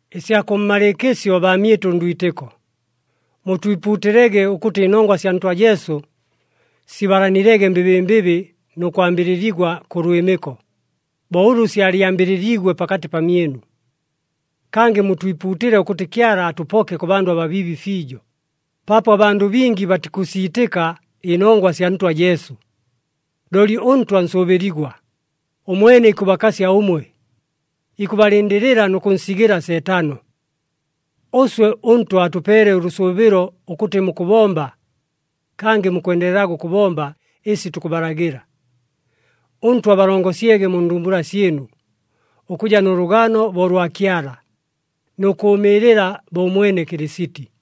Ɨsya kʉmmalɨɨkɨsyo baamyɨtʉ ndwitɨko, mutwipuutɨlege ʉkʉtɨ ɨnongwa sya Ntwa Jesu, sibalanilege mbɨbɨmbɨbɨ nʉ kwambɨlɨligwa kʉ lwɨmɨko, bo ʉlʉ syalyambɨlɨliigwe pakatɨ pamyɨnu. Kangɨ mutwipuutɨle ʉkʉtɨ Kyala atʉpoke kʉ bandʉ ababiibi fiijo, paapo abandʉ bingi batikʉsiitɨka ɨnongwa sya Ntwa Jesu. Looli ʉNtwa nsʉʉbɨligwa, ʉmwene ikʉbakasya ʉmwe, ikʉbalɨndɨlɨla nʉ kʉnsigɨla Seetano. Ʉswe ʉNtwa atʉpeele ʉlʉsʉʉbɨlo ʉkʉtɨ mukʉbomba, kangɨ mukwendelelaga ʉkʉbomba ɨsi tukʉbalagɨla. ɄNtwa abalongosyege mu ndumbula syɨnu, ʉkʉja nʉ lʉgano bo ʉlwa Kyala, nʉ kʉʉmɨɨlɨla bo ʉmwene Kɨlɨsiti.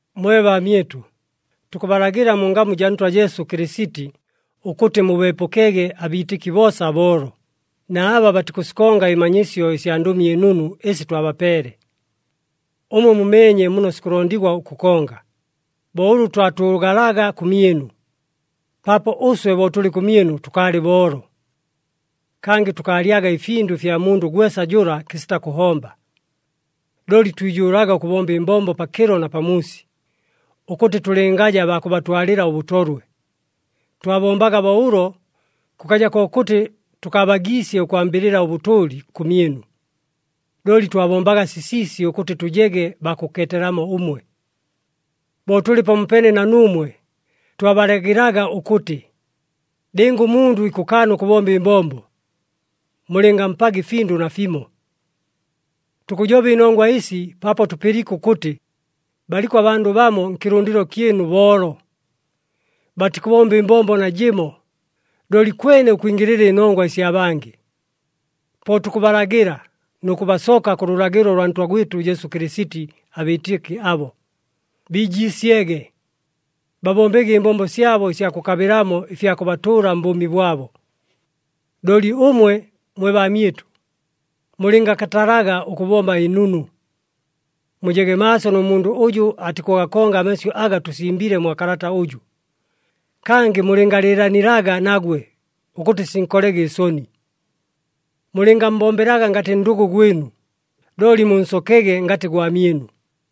Mwe baamyɨtʉ, tukʉbalagɨla mu ngamu jaa Ntwa Jesu Kɨlɨsiti ʉkʉtɨ mubeepʉkege abiitɨki boosa aboolo, na aba batikʉsikonga ɨmanyisyo ɨsya Ndʉmi ɨNunu ɨsi twabapeele. Ʉmwe mumeenye muno sikʉlondigwa ʉkʉkonga, bo ʉlʉ twatʉʉgalaga kʉmyɨnu, paapo ʉswe bo tʉlɨ kʉmyɨnu tʉkaalɨ boolo. Kangɨ tʉkaalyaga ɨfindʉ ɨfya mundʉ gwesa jʉla kɨsita kʉhomba. Looli twijʉʉlaga ʉkʉbomba ɨmbombo pakɨlo na pamuusi, ʉkʉtɨ tʉlɨngaja baa kʉbatwalɨla ʉbʉtolwe. Twabombaga bo ʉlo, kʉkaja kokʉtɨ tʉkaabagiisye ʉkwambɨlɨla ʉbʉtʉʉli kʉmyɨnu, looli twabombaga sisiisi ʉkʉtɨ tʉjege baa kʉkeetelamo ʉmwe. Bo tʉlɨ pamopeene na nuumwe, twabalagɨlaga ʉkʉtɨ, “Lɨnga ʉmundʉ ikʉkaana ʉkʉbomba ɨmbombo, mulɨngampaga ɨfindʉ nafimo.” Tukʉjoba ɨnongwa ɨsi paapo tʉpɨliike ʉkʉtɨ, baliko abandʉ bamo nkɨlʉndɨlo kyɨnu boolo, batikʉbomba ɨmbombo najɨmo, looli kwene ʉkwingɨlɨla ɨnongwa ɨsya bangɨ. Po tukʉbalagɨla nʉ kʉbasoka kʉ lʉlagɨlo lwa Ntwa gwɨtʉ Jesu Kɨlɨsiti abiitɨki abo, biijiisyege, babombege ɨmbombo syabo ɨsya kʉkabɨlamo ɨfya kʉbatʉʉla mbʉʉmi bwabo. Looli ʉmwe mwe baamyɨtʉ, mulɨngakatalaga ʉkʉbomba ɨnunu. Mujege maaso nʉ mundʉ ʉjʉ atikʉgakonga amasyʉ aga tʉsimbile mwa kalata ʉjʉ, kangɨ mulɨngalɨɨlanilaga nagwe ʉkʉtɨ sinkolege ɨsoni. Mulɨngammbombelaga ngatɨ ndʉgʉ gwɨnu, looli munsokege ngatɨ gwamyɨnu.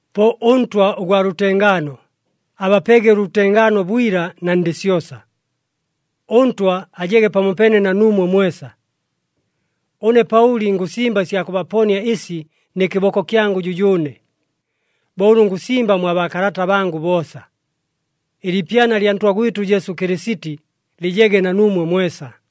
Po ʉNtwa ʉgwa lʉtengaano, abapege ʉlʉtengaano bwila na ndɨ syosa. ɄNtwa ajege pamopeene na nuumwe mwesa. Ʉne Paʉli ngʉsimba ɨsya kʉbaponia ɨsi nɨ kɨboko kyangʉ jʉjʉʉne, bo ʉlʉ ngʉsimba mwa baakalata bangʉ boosa. Ɨliipyana lya Ntwa gwɨtʉ Jesu Kɨlɨsiti lɨjege na nuumwe mwesa.